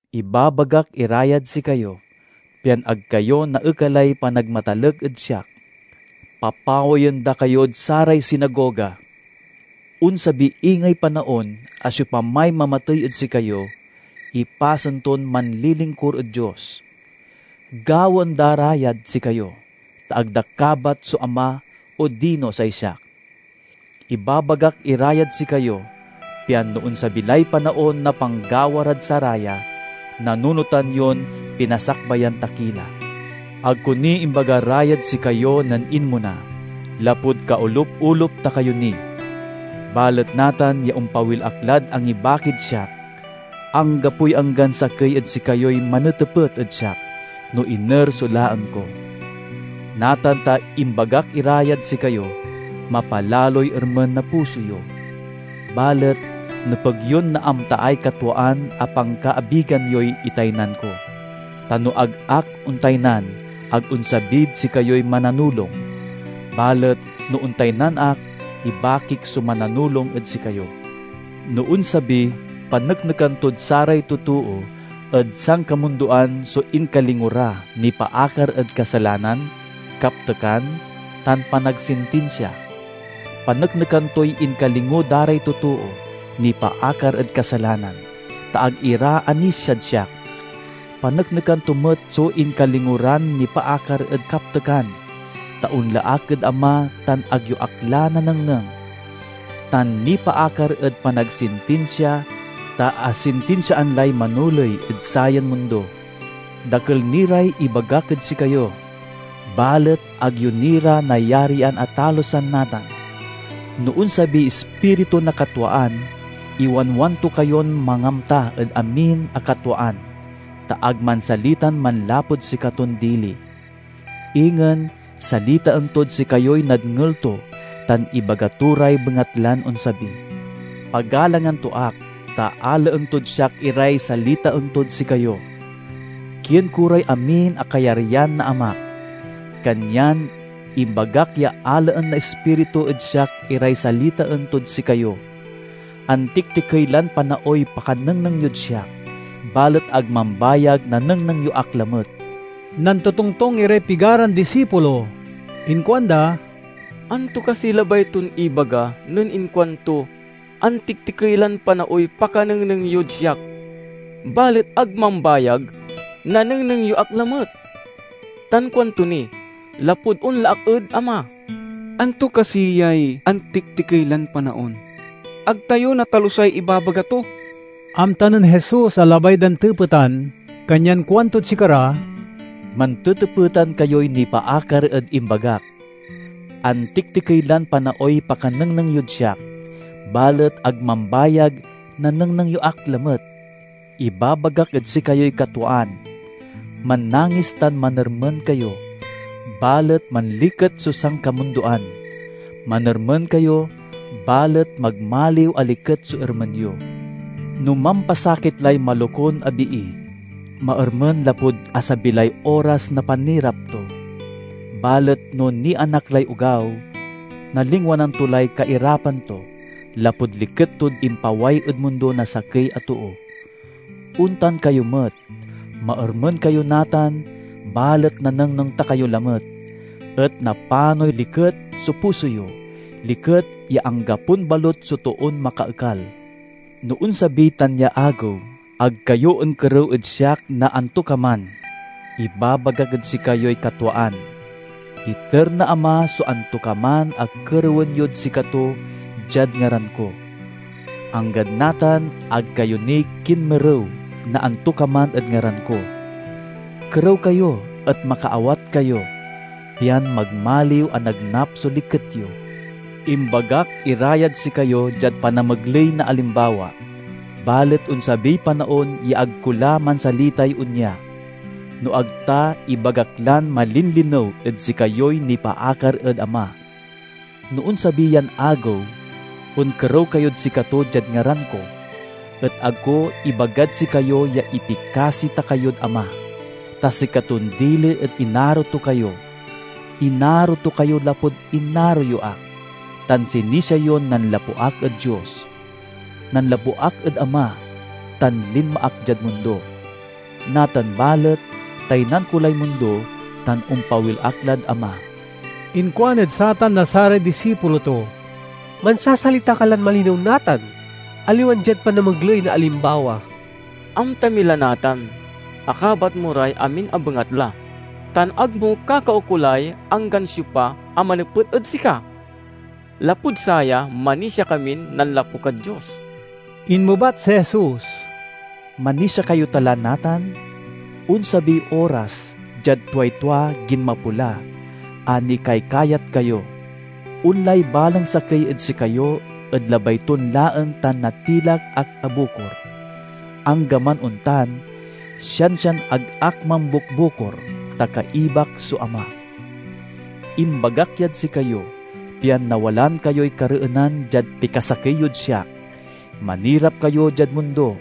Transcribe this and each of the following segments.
"Ibabagak ira yad sikayo, pian ag kayo naekalay panagmatalek ed siak. Papawayen da kayod saray sinagoga. Onsabi ingey panaon a siopamay mamatey ed sikayo, ipasen ton manlilingkur ed Dios. Gawaen da ra yad sikayo, ta ag da kabat so Ama odino say siak. Ibabagak ira yad sikayo, pian no onsabi lay panaon na panggawa rad saraya, nanunotan yon pinasakbayan ta ki la." "Ag ko ni imbaga ra yad sikayo nen inmona, lapud kaolup-olup ta kayo ni. Balet natan ya ompawil ak lad angibakid siak, anggapoy anggan sakey ed sikayoy manetepet ed siak no iner so laen ko. Natan ta imbagak ira yad sikayo, mapalaloy ermen na puso yo. Balet nepeg yon naamtaay katwaan a pankaabigan yoy itaynan ko, ta no ag ak ontaynan, ag onsabid sikayoy Mananulong; balet na ontaynan ak, ibakik so Mananulong ed sikayo. No onsabi paneknekan tod saray totoo ed sankamundoan so inkalingo ra nipaakar ed kasalanan, kaptekan, tan panagsintinsia. Paneknekan toy inkalingo da ray totoo nipaakar ed kasalanan, ta ag ira anisiad siak. Paneknekan to met so inkalingo ran nipaakar ed kaptekan, ta onla ak ed Ama tan ag yo ak la nanengneng; tan nipaakar ed panagsintinsia, ta asintinsiaan lay manoley ed sayan mundo. "Dakel ni ray ibagak ed sikayo, balet ag yo ni ra nayarian a talusan natan. No onsabiy Ispiritu na katwaan, iwanwan to kayon mangamta ed amin a katwaan, ta ag mansalitan manlapud sikaton dili. Ingen, salitaen tod sikayoy nadngel to tan ibaga to ray bengatlan onsabi. Pagalangan to ak, ta alaen tod siak iray salitaen tod sikayo. Kien ko ray amin a kayaryan na Amak, kanyan imbagak ya alaen na Ispiritu ed siak iray salitaen tod sikayo." "Antiktikey lan panaoy pakanengneng yod siak, balet ag mambayag nanengneng yo ak lamet." Nantotongtong iray pigaran disipulo. Inkuanda, "Anto kasiy labay ton ibaga nen inkuanto, 'Antiktikey lan panaoy pakanengneng yod siak, balet ag mambayag nanengneng yo ak lamet'? Tan kuanto ni, 'Lapud onla ak ed Ama.' Anto kasi yay 'antiktikey lan panaon'? Ag tayo natalusay ibabaga to!" Amta nen Jesus a labay dan tepetan, kanyan kuantod sikara, "Mantetepetan kayoy nipaakar ed imbagak, 'Antiktikey lan panaoy pakanengneng yod siak, balet ag mambayag nanengneng yo ak lamet.' Ibabagak ed sikayoy katwaan: mannangis tan manermen kayo, balet manliket so sankamundoan. Manermen kayo, balet magmaliw a liket so ermen yo. No mampasakit lay malokun a bii, maermen lapud asabi lay oras na panirap to. Balet no nianak lay ogaw, nalingwanan to lay kairapan to, lapud liket tod impaway ed mundo na sakey a too. Ontan kayo met: maermen kayo natan, balet nanengneng ta kayo lamet, et napanoy liket so puso yo, liket ya anggapon balut so toon makaekal. "No onsabiy tan ya agew, ag kayo onkerew ed siak na antokaman. Ibabagak ed sikayoy katwaan: iter na Ama so antokaman a kerewen yod sikato diad ngaran ko. Anggad natan ag kayo ni kinmerew na antokaman ed ngaran ko. Kerew kayo et makaawat kayo, pian magmaliw a nagnap so liket yo." "Imbagak ira yad sikayo diad panamegley na alimbawa. Balet onsabiy panaon ya ag ko la mansalitay onya, no ag ta ibagak lan malinlinew ed sikayoy nipaakar ed Ama. No onsabi yan agew, onkerew kayod sikato diad ngaran ko; et ag ko ibagad sikayo ya ipikasi ta kayod Ama, ta sikaton dili et inaro to kayo. Inaro to kayo lapud inaro yo ak, tan sinisia yon nanlapu ak ed Dios. Nanlapu ak ed Ama tan linma ak diad mundo. Natan balet taynan ko lay mundo tan ompawil ak lad Ama." Inkuan ed satan na saray disipulo to, "Mansasalita ka lan malinew natan, aliwan diad panamegley na alimbawa. Amta mi la natan a kabat mo ray amin a bengatla tan ag mo kakaukolay anggan siopa a manepet ed sika. Lapud saya manisia kamin nanlapu kad Dios." Inmebat si Jesus, "Manisia kayo ta la natan? Onsabiy oras, diad tuay tua ginmapo la, a nikaykayat kayo. Onlay balang sakey ed sikayo ed labay ton laen tan natilak ak a bukor. Anggaman ontan, siansian ag ak mambukbukor, ta kaibak so Ama. Imbagak yad sikayo, pian nawalaan kayoy kareenan diad pikasakey yod siak. Manirap kayo diad mundo,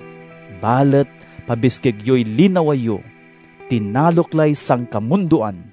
balet pabiskeg yoy linawa yo! Tinalok lay sankamundoan!"